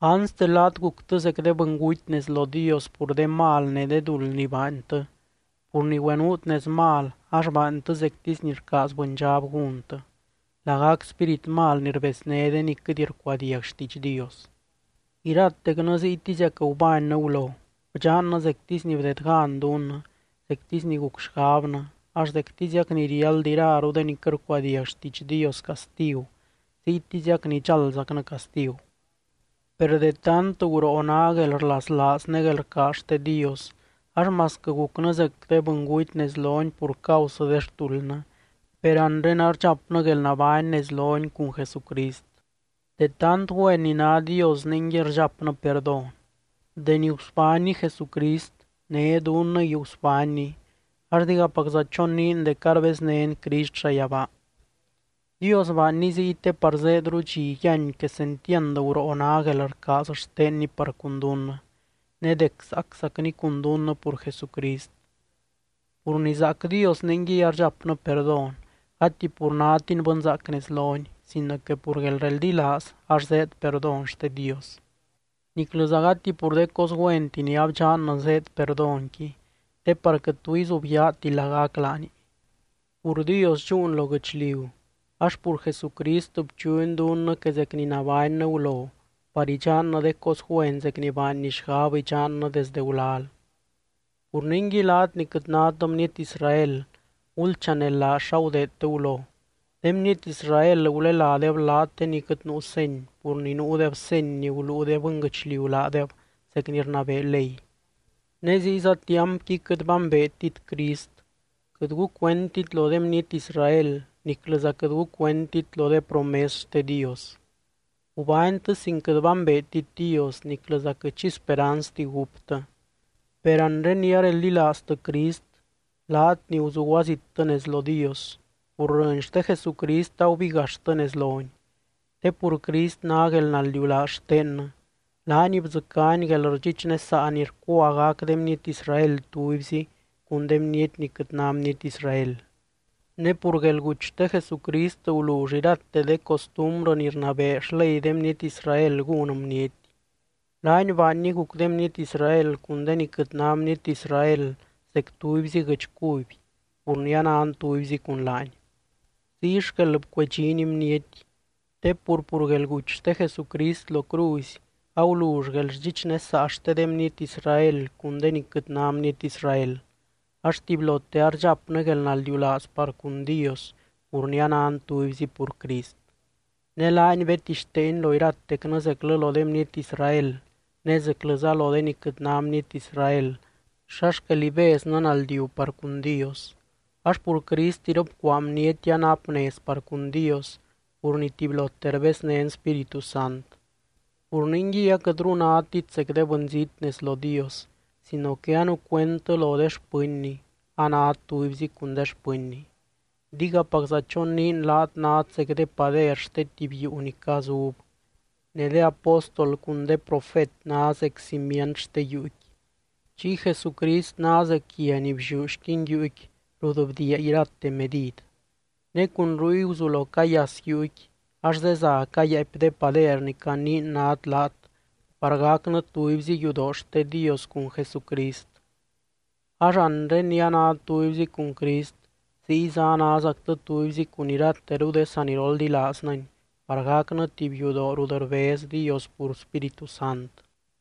Anste, laat guctɨ zec de bɨnguty nez lo Dios pur de mal ne de duld ni baantɨ, pur ni güenuut nez mal ax baantɨ zectisy ni rcaaz bɨndxab gúntɨ, lagac spírit mal ni rbezné de ni quɨt rcuadiagti xtiidx Dios. Iratecnɨ ziytiziac gubánnɨ gulo. Bdxannɨ zectisy ni bdedgan dunnɨ zectisy ni guc xgabnɨ ax zectiziac ni riáld iraru de ni quɨt rcuadiag xtiidx Dios castigu, ziytiziac nidxaldzacnɨ castigu. Per de tant guroo ná guelrlaslaaz ne guelrcaaz xte Dios ax masquɨ gucnɨ zec de bɨnguty nez lony pur causɨ de xtuldnɨ, per anre ardxapnɨ guelnabány nez lony cun Jesucrist. (De tant güen ni ná Dios ningui rdxapnɨ perdón.) Deni gusbánny Jesucrist né dunnɨngui gusbánny ax digapacza choniin dec arbeznén Crist llayabaa. Dios baanny ziy te par zéedru dxi yíany quesentiand guroo ná guelrcaaz xtenny par cun dunnɨ, ne dec zaaczacny cun dunnɨ pur Jesucrist. Pur ni zaac Dios ningui ardxapnɨ perdón, gati pur nátin bɨnzaac nez lony sino que pur guelreldilaaz ax zéed perdón xte Dios. Niclɨza gati pur de cos güenti ni abdxannɨ zéed perdónqui te par quɨt tu izubyaati lagac laani. Pur Dios dxúun lo guɨchliu ax pur Jesucrist bchuny dunnɨ que zec ni nabánnɨ gulo par idxannɨ de cos güen zec ni baanny xgab idxannɨ desdɨ gulal. Pur ningui laat ni quɨt nát bniety Israel gulchanelaaz xa gudeedtɨ gulo. De bniety Israel guleládeb laat de ni quɨt nuu seny pur ni nuudeb seny ni guluu de bɨnguɨchliu laadeb zec ni rnabee ley. Ne ziyza tiampqui quɨt bambeetit Crist, quɨt gucuendtit lo de bniety Israel niclɨza quɨt gucuendtit lo de promes xte Dios. Gubánytɨ sin quɨt bambeetit Dios niclɨza quɨt xi speranzti gúptɨ. Per anre ni areldilaaztɨ Crist laat ni guzuguazittɨ nez lo Dios, pur rɨny xte Jesucrist agubigaxtɨ nez lony. Te pur Crist ná guelnaldiulaaz xtennɨ. Laany bdzɨcány guelrdxichnesaa ni rcua gac de bniety Israel tubyzi cun de bniety ni quɨt ná bniety Israel. Ne pur guelguty xte Jesucrist gulull irate de costumbrɨ ni rnabee xley de bniety Israel gún bniety, laany baanny guc de bniety Israel cun de ni quɨt ná bniety Israel zec tubyzi guɨdx cuby pur ni anan tubyzi cun laany. Ziy xquel bcuedxiny bniety. Te pur, pur guelguty xte Jesucrist lo cruzy agulull guelrdxichnesaa xte de bniety Israel cun de ni quɨt ná bniety Israel, ax tubylote ardxapnɨ guelnaldiulaaz par cun Dios pur ni anan tubyzi pur Crist. Ne laany bedtixteeny lo iratecnɨ, zeclɨ lo de bniety Israel ne zeclɨza lo de ni quɨt ná bniety Israel, xa xquel ibeznɨ naldiu par cun Dios. Ax pur Crist iropcuaa bniety anap nez par cun Dios pur ni tubylote rbeznén Spíritu Sant. Pur ningui aquɨtru nátit zec de bɨnzít nez lo Dios sino que anucuendtɨ lo de xpɨnny, anát tubyzi cun de xpɨnny. Digapacza choniin laat nát zec de pader xte tuby yuu ni cazub, ne de apóstol cun de profet ná zec cimient xte yuuqui. Chiy Jesucrist ná zec guia ni blliú xquin yuuqui rut bdiia irate medid. Ne cun ruy guzulo cayas yuuqui ax zeza cayáapy de pader ni caniin nát laat par gacnɨ tubyzi yudoo xte Dios cun Jesucrist. Ax anre ni anát tubyzi cun Crist ziyza anázactɨ tubyzi cun irateru de saniroldilaaznɨny par gacnɨ tuby yudoo rut rbez Dios pur Spíritu Sant.